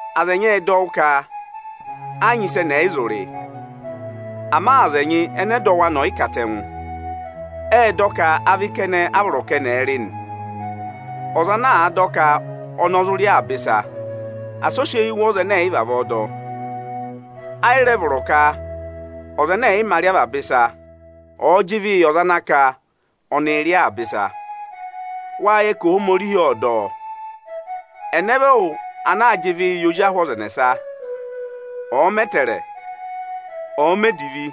Aza ẹnyị ệ dọ wụ́ ka ẹ yị nyị ịsị ẹnị ẹ̀ yị zụ rị. Ama aza ẹnyị ẹnẹ ẹdọwụ anị ọ̀ yị katẹngụ, ệ dọ ka avị kẹnẹ a vọrọ ka ẹnị ẹ̀ẹ rị nị. Ọza ana dọ ka ọnị ọ zụ rị avaba ịsa, asị ọ sị eyi wụ̀ ọza ẹnẹ ẹ̀ yị vavọọ dọ! Ayị rẹ vọrọ ka ọza ẹnẹ ẹ̀ yị mā rị avaba ịsa, ọ̀ọ jị ịvịị yị ọza ana ka ọnịị̄ rị avaba ịsa! Wâ yẹ ka Ohomorihi ộ dọ ọ. Ẹnẹ vị ẹwụ ana aa naa jị ịvị yị ozi ahụ ọza ẹnẹsa? Ọ̀ọ mẹ ẹtẹẹrẹ, ọ̀ọ mẹ divi,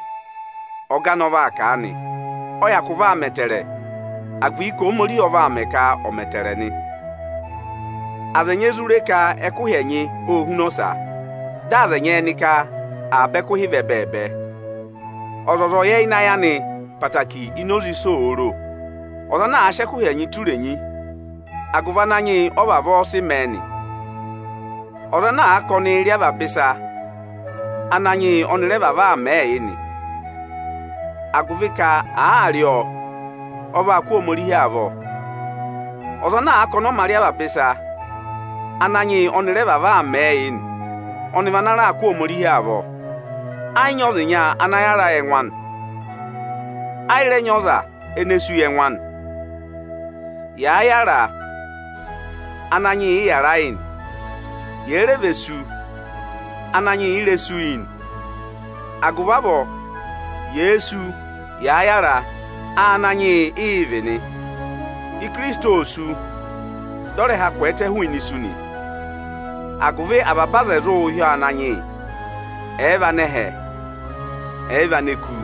ọga anị ọ vaa kà a nị. Ọ hyakụ vaa mẹ ẹtẹẹrẹ, agụvị ka Ohomorihi ọ vaa mẹẹ ka ọ̀ mẹ ẹtẹẹrẹ nị. Aza ẹnyị e zụ re ka ẹkụhị ẹnyị ô huna ọsa. Dị aza ẹnyị ẹnị ka avaba ẹkụhị vị ẹbẹẹbẹ. Ọzọza ọ̀ yẹ ịnị ayị anị ẹtẹẹtẹrẹ ini oze ịsị òo ro! Ọza ana àa sị ẹkụhị ẹnyị tụ́ irenyi, agụvị Ananyị yị ọ vavọọ aa sịị mẹẹ nị nị. Ọza ana ka ọnịị̄ rị avaba ịsa, Ananyị yị ọ́nị rẹ vavọọ aa mẹẹ yị nị, agụvị ka àaa rị ọọ, ọ vaa kụ́ Ohomorihi avọ. Ọza ana ka ọnị ọ mā rị avaba ịsa, Ananyị yị ọ́nị rẹ vavọọ aa mẹẹ yị nị; ọnị va na raa kụ́ Ohomorihi avọ. Ẹ yị nyị ọza ịnya ayị ana yàra yị ẹngụ anị; ayị rẹ nyị ọza ene sú yị ẹngụ anị. Yàa yàra, Ananyị yị ị yàra yị nị. Yèe re ve sú, Ananyị yị i re sú yị nị. Agụvị avọọ, yèe sú, yàa yàra, Áananyị yị ị yị vị nị. Ikirisiti ô sú, dị ọ rẹ ha kwẹẹtẹ hụụnị isu nị, agụvị avaba aza ẹ̀ zụụ hị́ ọọ Ananyị yị, ẹ̀ẹ vị anẹhẹ, ẹ̀ẹ vị aneku.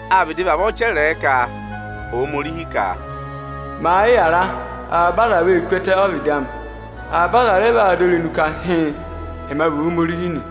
Â vịdị vavọọ chẹrẹẹ ka Ohomorihi ka, “Màa yị yàra, avaba aza vee ku ẹtẹ ọ́vịdị amị, avaba aza rẹ vaa dọ irenu ka, hịịn, ẹma vị Ohomorihi nị.”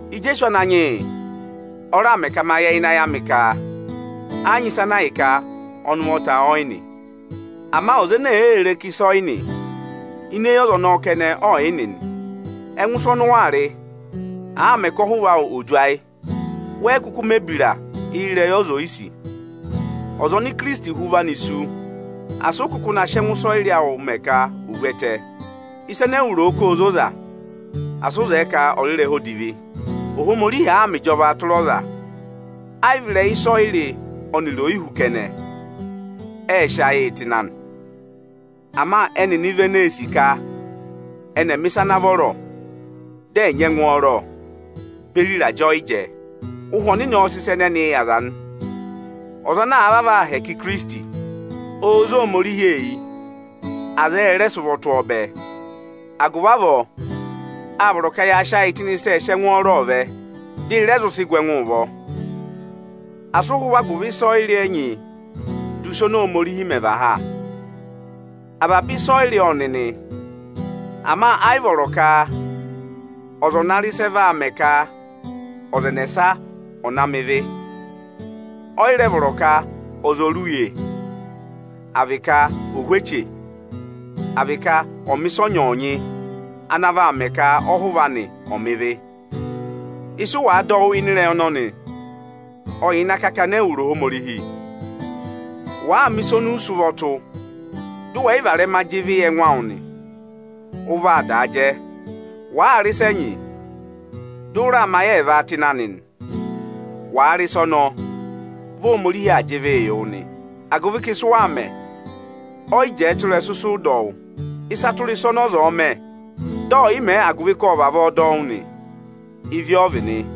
Ijeesu Ananyị yị o raà mẹ ka ma yẹ ịnị ayị amị ka ẹ yị nyị ịsa ana ahịka ọnị ụvọta ọyị nị. Ama ọza ene èe re ka ịsa ọ̀yị nị, ini eyi ọza ọnọọ kẹnẹ ọọ̀ yị nị nị. Ẹngụ ịsa ọnị ụ waa rị, àaa mẹ ka ọhụva awụ òo du ayị, wẹ yị kụkụ mẹ̀ ebira ịrẹyị ọza oyisì. Ọza oni Ikirisiti hụ ụvị anị sú, asị ụ kụkụ na sị ẹngụ ịsọyịrị awụ mẹ ka ò vu ẹtẹ! Ịsa ene ewu ro ka óo zoza, asị ụ zẹẹ ka ọ̀ rị ịrẹha odivi! Ohomorihi àaa mẹ ịjọvaa tụra ọza, ayị vị ịrẹyị ịsọyịrị ọnịrị oyihú kẹnẹ, ẹẹ̄ sị ayịị tụ́ ịnị anị. Ama ẹnịnị vị eneē sì ka ẹnị ẹ̀ẹ mẹ̀ ịsa ana vọrọ, dị ẹ̀ nyị ẹngwọọrọ beri ịrajẹ ọyịjẹ. Ụhwẹ Ọnịnị ọọ̄ sị ịsa ẹnẹnịị yị aza nị. Ọza ana àa vavọọ aa hẹkẹ Ikirisiti, óo zé Ohomorihi eyi, aza ẹ rẹ sị ụvọ tụ́ ọọ bẹẹ. Agụvị avọọ, â vọrọ ka ya sị ayị tụ́ ịnị ịsị ẹẹ̄ sị ẹngwọọrọọ vẹ, dị ị rẹ zụ sị gụ ẹngụụ ụvọ. Asị ụ hụ agụvị ịsọyịrị ẹnyị du ịsa ọnị Ohomorihi mẹ và ha! Avaba ịsọyịrị ọ nị nị; ama ayị vọrọ ka ọza ọ̀ na rị ịsị ẹ vaa mẹ ka ọza ẹnẹsa ọ̀ na mẹ ịvị. Ọyị rẹ vọrọ ka ọza ọ̀ uye, à vị ka ò hú eche, àa vị ka ọ̀ mẹ̀ ịsa ọnyọọnyị ana vaa mẹ ka ọhụva anị ọ̀ mẹ ịvị. Ịsụ wàa dọ wụ́ ịnị ịrẹyị ọnọnị, ọ̀ yà ịnị akakana ẹwụrị Ohomorihi! Wàaa mẹ̀ ịsa ọnị ụ sị ụvọ tụ́, dụ wẹ̀ yị rẹ varẹma jị ịvị yị ẹngụ awụ nị, ụ vaa daa jẹ. Wàaa rị ịsa ẹnyị, dị ụ raa mẹ ayị ẹẹva tụ́ ịnị anị nị, wàa rị ịsa ọnọọ, vị Ohomorihi aa jị ịvịị yị wụ nị, agụvị ka ịsị ụ waa mẹ, ọyị jẹẹ tụ́ ịrẹsụ ịsụ ụ dọ wụ́. Ịsa tụra ịsa ọnị ọza ọ̀ọ mẹ, dị ọ̀ yị mẹẹ agụvị ka ộ vavọọ dọ wụ́ nị, ịvị ọ vị nị.